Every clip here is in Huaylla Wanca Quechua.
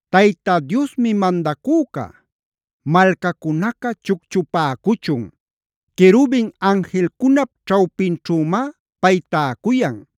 ¡Tayta Diosmi mandacüca! Malcacunaca chucchupäcuchun. Querubin anjilcunap ćhawpinćhümá pay täcuyan.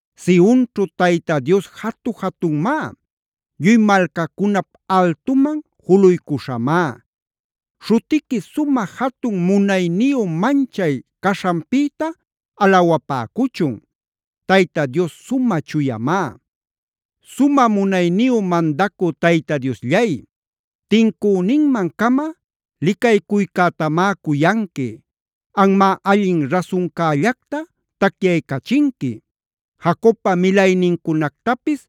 Sionćhu Tayta Dios jatu-jatunmá. Lluy malcacunap altuman juluycuśhamá. ¡Śhutiqui, sumä jatun munayniyu manchay caśhanpïta alawapäcuchun! ¡Tayta Dios sumä chuyamá! Sumä munayniyu mandacü Tayta Diosllay, tincüninman-cama licaycuycätamá cuyanqui. Anmá allin rasuncällacta tacyaycachinqui. Jacobpa milaynincunactapis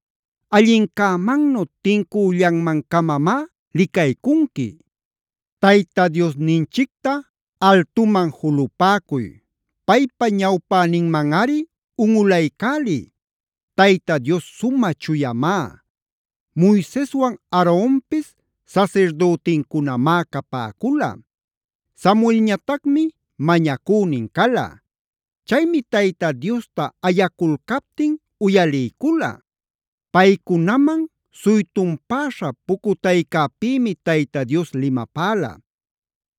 allincämannu, tincüllanman-camamá licaycunqui. ¡Tayta Diosninchicta altuman julupäcuy! ¡Paypa ñawpäninmanꞌari unꞌulaycäliy! ¡Tayta Dios sumä chuyamá! Moiseswan Aaronpis sasirdütincunamá capäcula. Samuelñatacmi mañacünin cala. Chaymi Tayta Diosta ayaculcaptin uyaliycula. Paycunaman suytunpäśha pucutaycäpimi Tayta Dios limapäla.b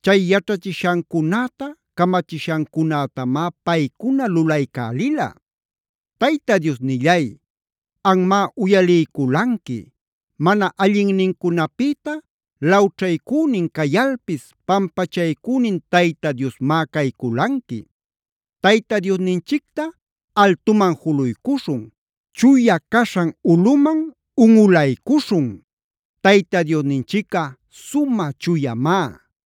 Chay yaćhachishancunäta, camachishancunätamá paycuna lulaycälila. Tayta Diosnillay, anmá uyaliyculanqui. Mana allinnincunapïta lawćhaycünin cayalpis, pampachaycünin Tayta Diosmá cayculanqui. Tayta Diosninchicta altuman juluycuśhun, chuya caśhan ulꞌuman unꞌulaycuśhun. Tayta Diosninchicꞌa sumä chuyamá.